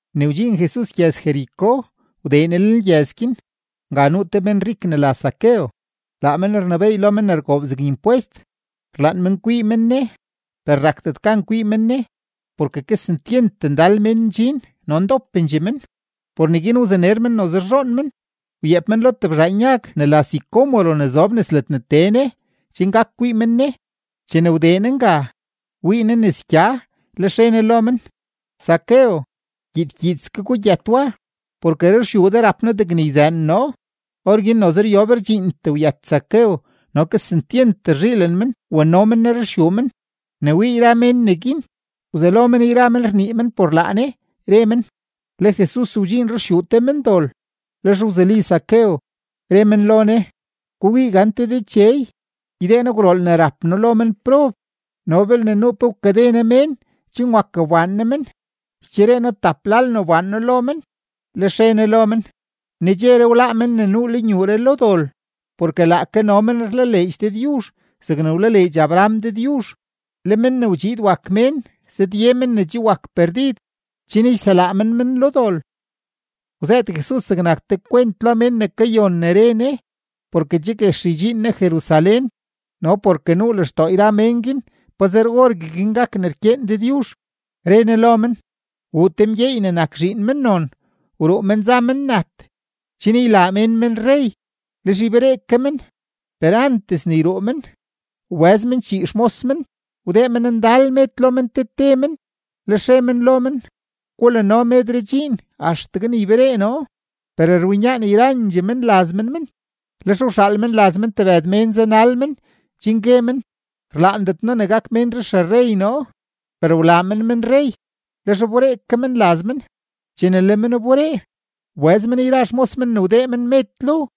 Ne wdxiin Jesus gyëz-Jericó, wdee Ne lenlgyëz guin. Nga nuu te menrik ne la Zaqueo; laa men rnebééy lo men ne rgoob zeg impwest. Rlaan men kwii men Ne, per rakdet gan kwii men Ne porke kesentyent ndal mén ndxin no ndopendxee men. Por neguin wzaner men noze rzhoon men, wyeep men lo tebzhaan yag ne la sicómoro ne zob nes ledne tee Ne chen gak kwii men Ne. Chene wdee Ne nga, wii Ne nes gya, lex re Ne lo men: ―Zaqueo, gyiid gyiidske gugyët wa, porke ruxyuu de rap noo degne yzëën noo. Orguin noze ryob rdxiintee wyët Zaqueo, no kesentyent rzhiilen men wano men Ne ruxyuu men. Ne wii yra mén neguin, wzelo men yra men rnii men por laa Ne, re men: ―Le Jesus wdxiin ruxyuu te mendol. Lex wzuli Zaqueo, re men lo Ne: ―Gukwii gante Dechey, ydee noo gwrool ne rap noo lo menprob, no belne nuu pe wkade noo mén chen wak wbaan noo men, ycheree noo tap lal ne wbaan noo lo men. Lex re Ne lo men: ―Nedxeree wláá men ne nuu lenyuuree lo dol, porke laake no men rlaleedx Dëdyuzh zegne wlaleedx Abraham Dëdyuzh. Le Men ne wdxiid wak Mén zëdye mén ne che wak perdid chen yselaa men men lo dol. Wzëët Jesus zegnak te kwent lo mén ne kayon ne re Ne, porke che guex ydxiin Ne Jerusalén no porke nuu lextoo yra mén guin pazer orgueguin gak ne rkyeen Dëdyuzh. Re Ne lo men: ―Wuu te mgyeey ne nak zhiin mennon, wruu men za men nat chen ylaa mén men rrey, lex yberee ke men. Per antes ne yruu men, wbëz men chii xmos men, wdee men ndal med lo men te te men, lex re men lo men: “Gulano medree dxiin axtegue ne yberee noo.” Per rwinyaan yrandxee menlaz men men, lex wxaal menlaz men tebëd mén zanal men chen gue men: “Rlaandet noo ne gak ménree xerrey noo.” Per wlaa mén men rrey, lex wberee ke men laz men. Chene le men wberee, wbëz men yra xmos men ne wdee men med lo,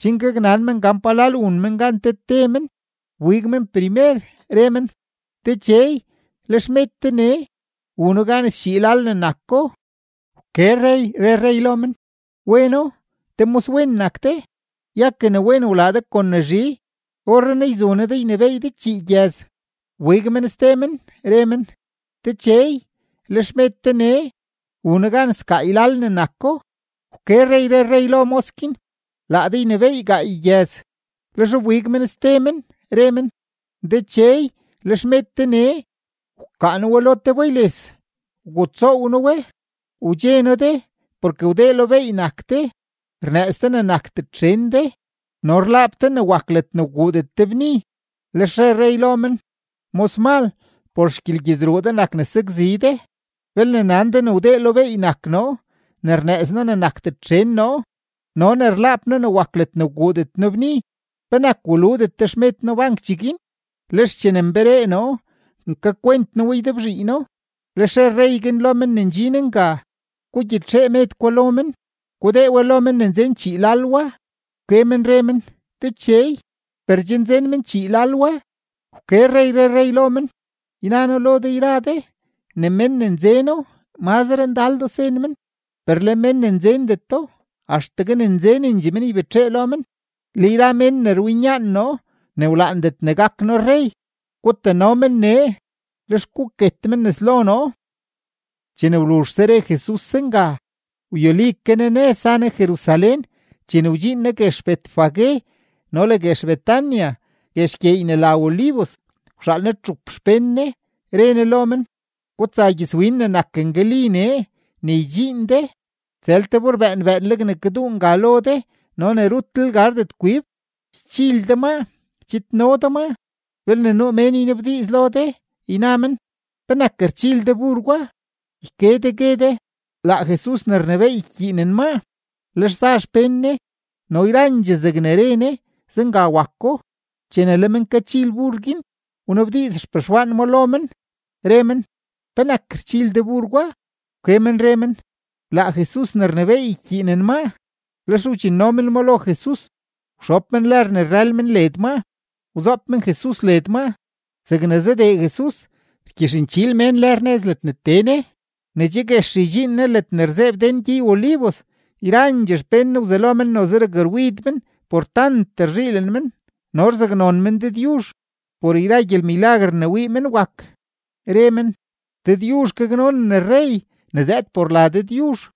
chen gaknan men gan palal wun men gan te te men. Wbig men primer, re men: “Dechey, le xmed de nee; wuno gan schii lal ne nako.” Wke rrey, re rrey lo men: “Weno, te moswen nak de; ya ke ne wen wlaa de kon ne zhi, orrenaa yzu noo de ynebééy de chii gyëz.” Wbig men ste men, re men: “Dechey, le xmed de nee; wuno gan sgaay lal ne nako.” Wke rrey, re rrey lo mos guin: “Laa de ynebééy gaay gyëz.” Lex wbig men ste men, re men: “Dechey, le xmed de nee; wkaa noo we te lo bayles, wgutsoow noo we. Wdxe noo de porke wdee beey nak de, rnëëz de ne nakdet xen de, no rlaap de ne wak ledne wguudet de bni.” Lex re rrey lo men: “Mosmal, por xgyelgyedruu de nak ne sakzi de. Belne nan de ne wdee beey nak noo, ne rnëëz noo ne nakdet xen noo, no ne rlaap noo ne wak ledne wguudet noo bni, ¿penak waludet de xmed noo bank cheguin? Lex chene nberee noo, nkakwent noo we ydebzhiino.” Lex re rrey guin lo men ne ndxin nga: “Gugyitxee med gwa lo men, gudee we lo men ne nzen chii lal wa.” Wke men re men: “Dechey, per che nzen men chii lal wa.” Wke rrey, re rrey lo men: “Yna noo lo de yra de ne mén ne nzeno, mazre ndaldoo sen men; per le mén ne nzendeto, axtegue ne nzenendxee men ybetxee lo men. Le yra mén ne rwinyaan noo ne wlaandet ne gak noo rrey, gutano men nee, lex guket men nes lo noo.” Chene wluzhse re Jesus zenga, wyuli ke Ne nëz, za Ne Jerusalén. Chene wdxiin Ne guex Betfagé no le guex Betania guex gyeey ne la Olivos, wxaal Ne txup xpén Ne, re Ne lo men: ―Gutsa gyëzwin ne nak ngali nee. Ne ydxiin de, tsël te bur bëën bëënleg ne kaduu nga lo de no ne rutlel gardet kwib. Ychil de ma, chidno de maa. Belne nuu mén ynabdiiz lo de, yna men: “¿Penak rchil de bur gwa?”, yke de, gue de: “Laa Jesus ne rnebééy ykyiinen maa.” Lex za xpén Ne, no yrandxee zegne re Ne, zenga wako. Chene le men kachil bur guin, wnabdiiz xpexwaan ma lo men, re men: ―¿Penak rchil de bur gwa? Wke men re men: ―Laa Jesus ne rnebééy ykyiinen maa. Lex wdxinno men ma lo Jesus, wxob men lër ne rrël men led maa, wzoob men Jesus led maa. Zegne zadee Jesus, rgyixnchiil mén lër nëz ledne tee Ne. Ne che guex ydxiin Ne ledne rzeeb den gyey-Olivos, yrandxee xpén Ne wzelo men noze rakrwid men por tant rzhiilen men no rzaknon men Dëdyuzh por yra gyelmilaguer ne wii men wak. Re men: ―¡Dëdyuzh gaknonen rrey ne zëëd por la Dëdyuzh!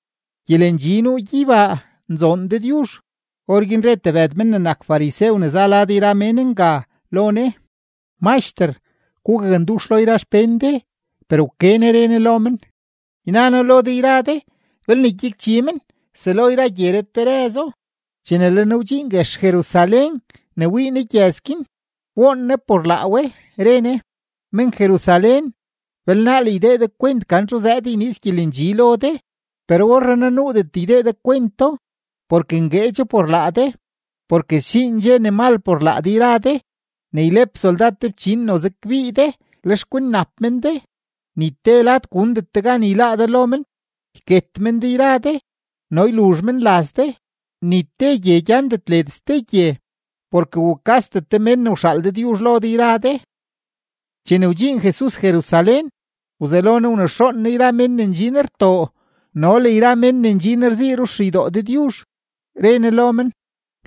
Gyelendxi nuu gyeybaa; nzoon Dëdyuzh. Orguin re tebëd men ne nak farisew ne za lad yra mén nga, lo Ne: ―Maxter, gugakndux lo yra xpén de. Per wke Ne re Ne lo men: ―Yna noo lo de yra de, belne gyakchi men, selo yra gyeree terëzo. Chene le Ne wdxiin guex Jerusalén ne wii Ne gyëz guin, woon Ne por laa we. Re Ne: ―Men-Jerusalén, belnaal ydee de kwent gan txu zëëd yniiz gyelendxi lo de, per orrenaa nuudet ydee de kwento porke ngueedxo por laa de. Porke sdxiin dxe ne mal por laa de yra de, ne ylep soldad te fchin noze kbii de, lex kwinnap men de; ni te lad gundet de gan yláá de lo men. Yket men de yra de no yluzh men laz de. Ni te gye gyandet led ste gye, porke wukasdet de mén ne wxaal Dëdyuzh lo de yra de. Chene wdxiin Jesus Jerusalén, wzelo Ne wnexoon Ne yra mén ne ndxin rtoo no le yra mén ne ndxin rzii ruxeydoo Dëdyuzh. Re Ne lo men: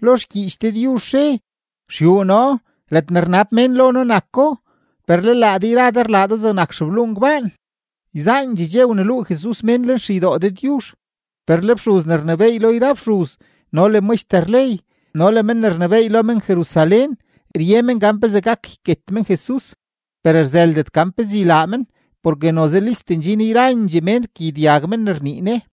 ―Lo xgyiich Dëdyuzh re: “Xyuu noo, ledne rnab mén lo noo nako”; per le laa de yra de rlaa do zegnak xebluu ngbaan. Yzaandxee dxe wneluu Jesus mén lenxeydoo Dëdyuzh. Per le fxuz ne rnebééy lo yra fxuz no le maxter ley no le men ne rnebééy lo men-Jerusalén, rye men gan pezee gak yket men Jesus. Per rzëldet pezee ylaa men, porke noze list ndxin yrandxee mén rkagyedyag men ne rnii Ne.